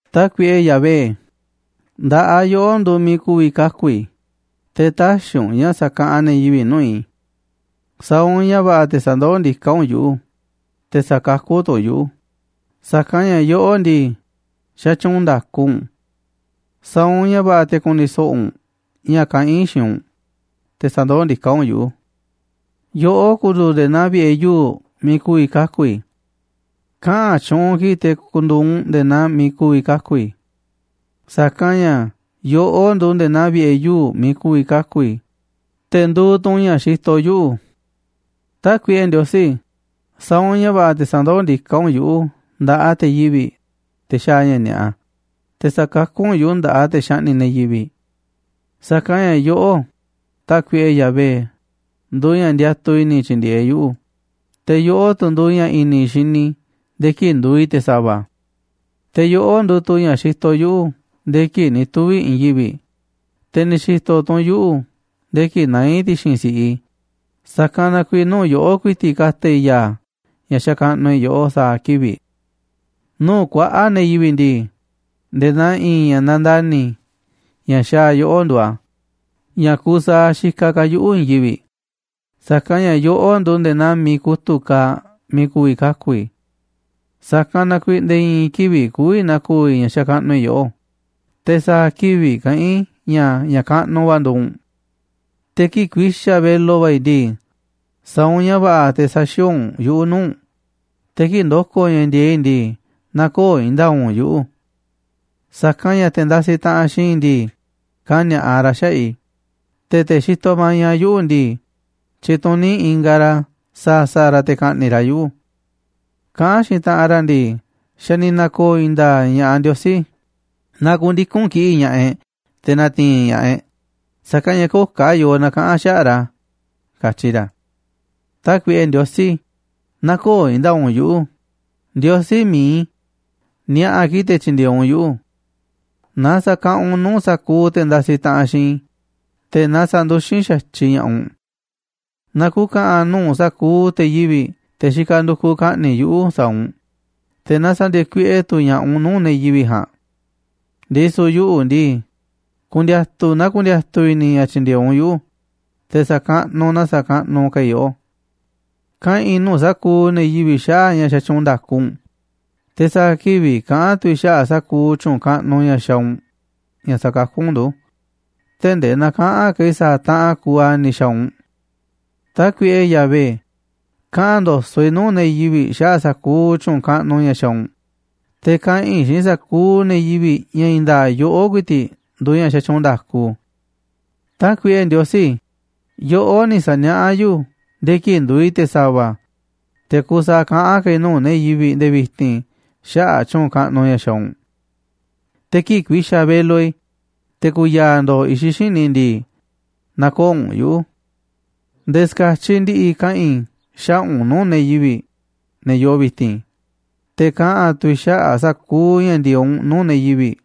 Tákuiꞌe Yahvé, nda̱ꞌaꞌ yoꞌó nduuꞌ miiꞌ ku̱vi̱ kaku̱ i̱, te̱ tä̱xi̱ u̱nꞌ ña̱ sa̱kaꞌanꞌ ne̱ yivi̱ꞌ nuu̱ꞌ i̱. Sa̱a̱ u̱nꞌ ña̱ va̱ꞌa̱ te̱ sa̱ndoó ndiká u̱nꞌ yuꞌu̱, te̱ sa̱kakú tu̱ u̱nꞌ yuꞌu̱, sa̱kanꞌ ña̱ yoꞌó ndii, xatyuunꞌ nda̱ku u̱nꞌ. Sa̱a̱ u̱nꞌ ña̱ va̱ꞌa̱ te̱ ku̱ni̱ so̱ꞌo̱ u̱nꞌ ña̱ kaꞌán i̱ xiinꞌ u̱nꞌ, te̱ sa̱ndoó ndiká u̱nꞌ yuꞌu̱. Yoꞌó ku̱ndu̱u̱ nde̱e̱ naa vi̱ꞌe̱ yuu̱ꞌ miiꞌ ku̱vi̱ kaku̱ i̱. Kaꞌa̱n tyuunꞌ kiꞌi̱ꞌ te̱ ku̱ndu̱u̱ u̱nꞌ nde̱e̱ naa miiꞌ ku̱vi̱ kaku̱ i̱. Sa̱kanꞌ ña̱ yoꞌó nduuꞌ nde̱e̱ naa vi̱ꞌe̱ yuu̱ꞌ miiꞌ ku̱vi̱ kaku̱ i̱, te̱ nduuꞌ tu̱ u̱nꞌ ña̱ xitoꞌ yuꞌu̱. Tákuiꞌe Ndiosí, sa̱a̱ u̱nꞌ ña̱ va̱ꞌa̱ te̱ sa̱ndoó ndiká u̱nꞌ yuꞌu̱ nda̱ꞌaꞌ te̱ yivi̱ꞌ, te̱ xaaꞌ ña̱ ni̱a̱ꞌa, te̱ sa̱kakú u̱nꞌ yuꞌu̱ nda̱ꞌaꞌ te̱ xaꞌni̱ꞌ ne̱ yivi̱ꞌ. Sa̱kanꞌ ña̱ yoꞌó, Tákuiꞌe Yahvé, nduuꞌ ña̱ ndiatuꞌ i̱ni̱ i̱ tyi̱ndi̱e̱eꞌ yuꞌu̱, te̱ yoꞌó tu̱ nduuꞌ ña̱ i̱ni̱ i̱ xini i̱ nde̱e̱ kii̱ꞌ nduuꞌ i̱ te̱ sa̱va̱. Te̱ yoꞌó nduuꞌ tu̱ ña̱ xitoꞌ yuꞌu̱ nde̱e̱ kii̱ꞌ ni̱ tuvi̱ i̱ i̱i̱n yivi̱ꞌ, te̱ ni̱ xi̱to̱ tu̱ u̱nꞌ yuꞌu̱ nde̱e̱ kii̱ꞌ naá i̱ ti̱xi̱n si̱ꞌiꞌ i̱, sa̱kanꞌ na kuiiꞌ nuu̱ꞌ yoꞌó ku̱i̱ti̱ꞌ ka̱ta̱ i̱ ya̱a̱ ña̱ xakaꞌnuꞌ i̱ yoꞌó sa̱a̱ kivi̱ꞌ. Nuu̱ꞌ kuaꞌa̱ꞌ ne̱ yivi̱ꞌ ndii, nde̱e̱ naa i̱i̱n ña̱ nandani̱ ña̱ xaaꞌ yoꞌó nduuꞌ a̱, ña̱ kuuꞌ saaꞌ xikaꞌ ka̱ yuꞌu̱ i̱i̱n yivi̱ꞌ, sa̱kanꞌ ña̱ yoꞌó nduuꞌ nde̱e̱ naa miiꞌ kutu̱ꞌ kaaꞌ miiꞌ ku̱vi̱ kaku̱ i̱. Sa̱kanꞌ na kuiiꞌ nde̱e̱ i̱i̱n kivi̱ꞌ kü̱vi̱ na̱ko̱o̱ i̱ ña̱ xakaꞌnuꞌ i̱ yoꞌó, te̱ sa̱a̱ kivi̱ꞌ kaꞌán i̱ ña̱ ña̱ kaꞌnuꞌ va̱ nduuꞌ u̱nꞌ. Te̱ kii̱ꞌ ku̱i̱xa̱ velo va̱ i̱ ndii, sa̱a̱ u̱nꞌ ña̱ va̱ꞌa̱ te̱ sä̱xi̱o̱o̱ u̱nꞌ yuꞌu̱ nuu̱ꞌ u̱nꞌ, te̱ kii̱ꞌ ndo̱ko̱ ña̱ ndi̱e̱eꞌ i̱ ndii, nä̱ko̱o̱ i̱i̱n nda̱a̱ꞌ u̱nꞌ yuꞌu̱. Sa̱kanꞌ ña̱ te̱ ndasiꞌ taꞌanꞌ xiinꞌ i̱ ndii, kani̱a̱ꞌa ra̱ xaꞌa̱ꞌ i̱, te̱ te̱ xitoꞌ maña yuꞌu̱ ndii, tyituní ingaꞌ ra̱ sa̱a̱ sa̱a̱ ra̱ te̱ ka̱ꞌni̱ꞌ ra̱ yuꞌu̱. Kaꞌán xiinꞌ taꞌanꞌ ra̱ ndii: “Xa̱ ni̱ na̱ko̱o̱ i̱i̱n nda̱a̱ꞌ ña̱ꞌaꞌ Ndiosí, na ku̱ndiku̱n kiꞌi̱ꞌ ña̱ꞌaꞌ e̱ꞌ te̱ na̱ti̱i̱n ña̱ꞌaꞌ e̱ꞌ, sa̱kanꞌ ña̱ köo̱ꞌ ka̱ yoo na̱kaꞌa̱n xaꞌa̱ꞌ ra̱”, katyi ra̱. Tákuiꞌe Ndiosí, nä̱ko̱o̱ i̱i̱n nda̱a̱ꞌ u̱nꞌ yuꞌu̱, Ndiosí mi̱iꞌ i̱, ni̱a̱ꞌa̱ kiꞌi̱ꞌ te̱ tyi̱ndi̱e̱eꞌ u̱nꞌ yuꞌu̱. Na sa̱kaꞌanꞌ u̱nꞌ nuu̱ꞌ sa̱kuuꞌ te̱ ndasiꞌ taꞌanꞌ xiinꞌ i̱, te̱ na sa̱nduxín xa̱tyiꞌ ña̱ꞌaꞌ u̱nꞌ. Na ku̱ka̱ꞌa̱n nuu̱ꞌ sa̱kuuꞌ te̱ yivi̱ꞌ, te̱ xikaꞌ ndukuꞌ ka̱ꞌni̱ꞌ yuꞌu̱ sa̱a̱ u̱nꞌ, te̱ na sa̱ndi̱e̱e̱ kuiꞌe tu̱ ña̱ꞌaꞌ u̱nꞌ nuu̱ꞌ ne̱ yivi̱ꞌ ja̱a̱nꞌ. Ndisu̱ yuꞌu̱ ndii, ku̱ndi̱a̱tu̱ na ndiatuꞌ i̱ni̱ i̱ ña̱ tyi̱ndi̱e̱eꞌ u̱nꞌ yuꞌu̱, te̱ sa̱kaꞌnuꞌ na sakaꞌnuꞌ ka̱ i̱ yoꞌó. Kaꞌa̱n i̱ nuu̱ꞌ sa̱kuuꞌ ne̱ yivi̱ꞌ xaꞌa̱ꞌ ña̱ xatyuunꞌ nda̱ku u̱nꞌ, te̱ sa̱a̱ kivi̱ꞌ kaꞌa̱n tu̱ i̱ xaꞌa̱ꞌ sa̱kuuꞌ tyu̱u̱n kaꞌnuꞌ ña̱ xaaꞌ u̱nꞌ ña̱ sa̱kakú u̱nꞌ ndu̱, tee̱ꞌ ndee näkaꞌanꞌ ka̱ i̱ sa̱a̱ taꞌanꞌ kuuꞌ a̱ ni̱ xa̱a̱ u̱nꞌ. Tákuiꞌe Yahvé, kaꞌa̱n ndo̱so̱ꞌ i̱ nuu̱ꞌ ne̱ yivi̱ꞌ xaꞌa̱ꞌ sa̱kuuꞌ tyu̱u̱n kaꞌnuꞌ ña̱ xaaꞌ u̱nꞌ, te̱ kaꞌa̱n i̱ xiinꞌ sa̱kuuꞌ ne̱ yivi̱ꞌ ña̱ i̱i̱n nda̱a̱ꞌ yoꞌó ku̱i̱ti̱ꞌ nduuꞌ ña̱ xatyuunꞌ nda̱ku. Tákuiꞌe Ndiosí, yoꞌó ni̱ sa̱niaꞌá yuꞌu̱ nde̱e̱ kii̱ꞌ nduuꞌ i̱ te̱ sa̱va̱, te̱ kuuꞌ saaꞌ kaꞌán ka̱ i̱ nuu̱ꞌ ne̱ yivi̱ꞌ nde̱e̱ vi̱ti̱n xaꞌa̱ꞌ tyu̱u̱n kaꞌnuꞌ ña̱ xaaꞌ u̱nꞌ. Te̱ kii̱ꞌ ku̱i̱xa̱ velo i̱, te̱ ku̱ya̱a̱ ndo̱o̱ i̱xiꞌ xíniꞌ i̱ ndii, nä̱ko̱o̱ u̱nꞌ yuꞌu̱ nde̱e̱ ska̱tyiꞌ ndi̱ꞌi̱ kaꞌa̱n i̱ xaꞌa̱ꞌ u̱nꞌ nuu̱ꞌ ne̱ yivi̱ꞌ, ne̱ yoo vi̱ti̱n, te̱ kaꞌa̱n tu̱ i̱ xaꞌa̱ꞌ sa̱kuuꞌ ña̱ ndi̱e̱eꞌ u̱nꞌ nuu̱ꞌ ne̱ yivi̱ꞌ,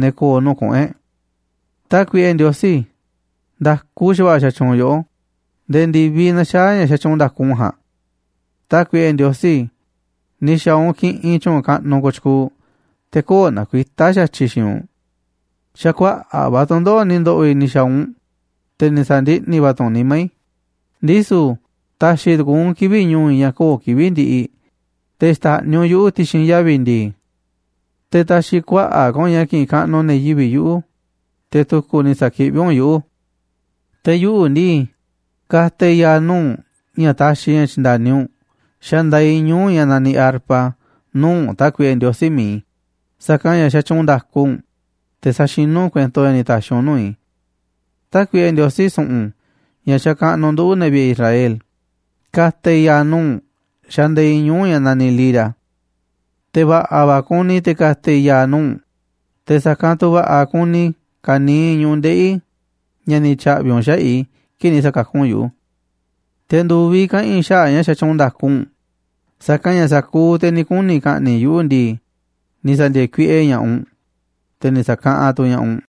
ne̱ ko̱o̱ nuu̱ꞌ kuꞌu̱n e̱ꞌ. Tákuiꞌe Ndiosí, nda̱ku xa̱va̱ꞌa̱ xatyuunꞌ yoꞌó nde̱e̱ ndi̱viꞌ naxaá ña̱ xatyuunꞌ nda̱ku u̱nꞌ ja̱a̱nꞌ. Tákuiꞌe Ndiosí, ni̱ xa̱a̱ u̱nꞌ kiꞌinꞌ tyu̱u̱n kaꞌnuꞌ kooꞌ tyukuuꞌ, te̱ köo̱ꞌ nakuitá xa̱tyiꞌ xiinꞌ u̱nꞌ. Xa̱ kuaꞌa̱ꞌ va̱ tu̱ndoꞌo̱ꞌ ni̱ ndo̱ꞌo̱ i̱ ni̱ xa̱a̱ u̱nꞌ, te̱ ni̱ sa̱ndiꞌni̱ va̱ tu̱ u̱nꞌ nimá i̱, ndisu̱ ta̱xi̱ tu̱ku̱u̱ u̱nꞌ kivi̱ꞌ ñu̱u̱ i̱ ña̱ köo̱ꞌ kivi̱ꞌ ndiꞌiꞌ, te̱ xta̱ꞌniꞌ u̱nꞌ yuꞌu̱ ti̱xi̱n yavi̱ ndi̱i̱. Te̱ ta̱xi̱ kuaꞌa̱ꞌ ka̱ u̱nꞌ ña̱ ki̱ꞌi̱n kaꞌnuꞌ ne̱ yivi̱ꞌ yuꞌu̱, te̱ tu̱ku̱ ni̱ sa̱kiꞌví u̱nꞌ yuꞌu̱. Te̱ yuꞌu̱ ndii, ka̱ta̱ i̱ ya̱a̱ nuu̱ꞌ u̱nꞌ ña̱ taxiꞌ i̱ ña̱ tyi̱nda̱ni u̱nꞌ xandaaꞌ i̱ ñuu̱ꞌ ña̱ naniꞌ arpa nuu̱ꞌ u̱nꞌ, Tákuiꞌe Ndiosí mi̱iꞌ i̱, sa̱kanꞌ ña̱ xatyuunꞌ nda̱ku u̱nꞌ, te̱ saxinú u̱nꞌ kuento ña̱ ni̱ ta̱xi̱ u̱nꞌ nuu̱ꞌ i̱. Tákuiꞌe Ndiosí su̱ꞌu̱n, ña̱ xakaꞌnuꞌ nduꞌu̱, ne̱ vi̱ꞌe̱ Israel, ka̱ta̱ i̱ ya̱a̱ nuu̱ꞌ u̱nꞌ xandaaꞌ i̱ ñu̱u̱ ña̱ naniꞌ lira. Te̱ va̱ꞌa̱ va̱ kuni i̱ te̱ ka̱ta̱ i̱ ya̱a̱ nuu̱ꞌ u̱nꞌ, te̱ sa̱kanꞌ tu̱ va̱ꞌa̱ kuni ka̱niiꞌ ñu̱ꞌuꞌ ndeꞌi̱ i̱ ña̱ ni̱ tya̱ꞌvi̱ u̱nꞌ xaꞌa̱ꞌ i̱ kii̱ꞌ ni̱ sa̱kakú u̱nꞌ yuꞌu̱. Te̱ ndu̱viꞌ kaꞌa̱n i̱ xaꞌa̱ꞌ ña̱ xatyuunꞌ nda̱ku u̱nꞌ, sa̱kanꞌ ña̱ sa̱kuuꞌ te̱ ni̱ kuni̱ ka̱ꞌni̱ꞌ yuꞌu̱ ndii, ni̱ sa̱ndi̱e̱e̱ kuiꞌe ña̱ꞌaꞌ u̱nꞌ, te̱ ni̱ sa̱kaꞌanꞌ tu̱ ña̱ꞌaꞌ u̱nꞌ.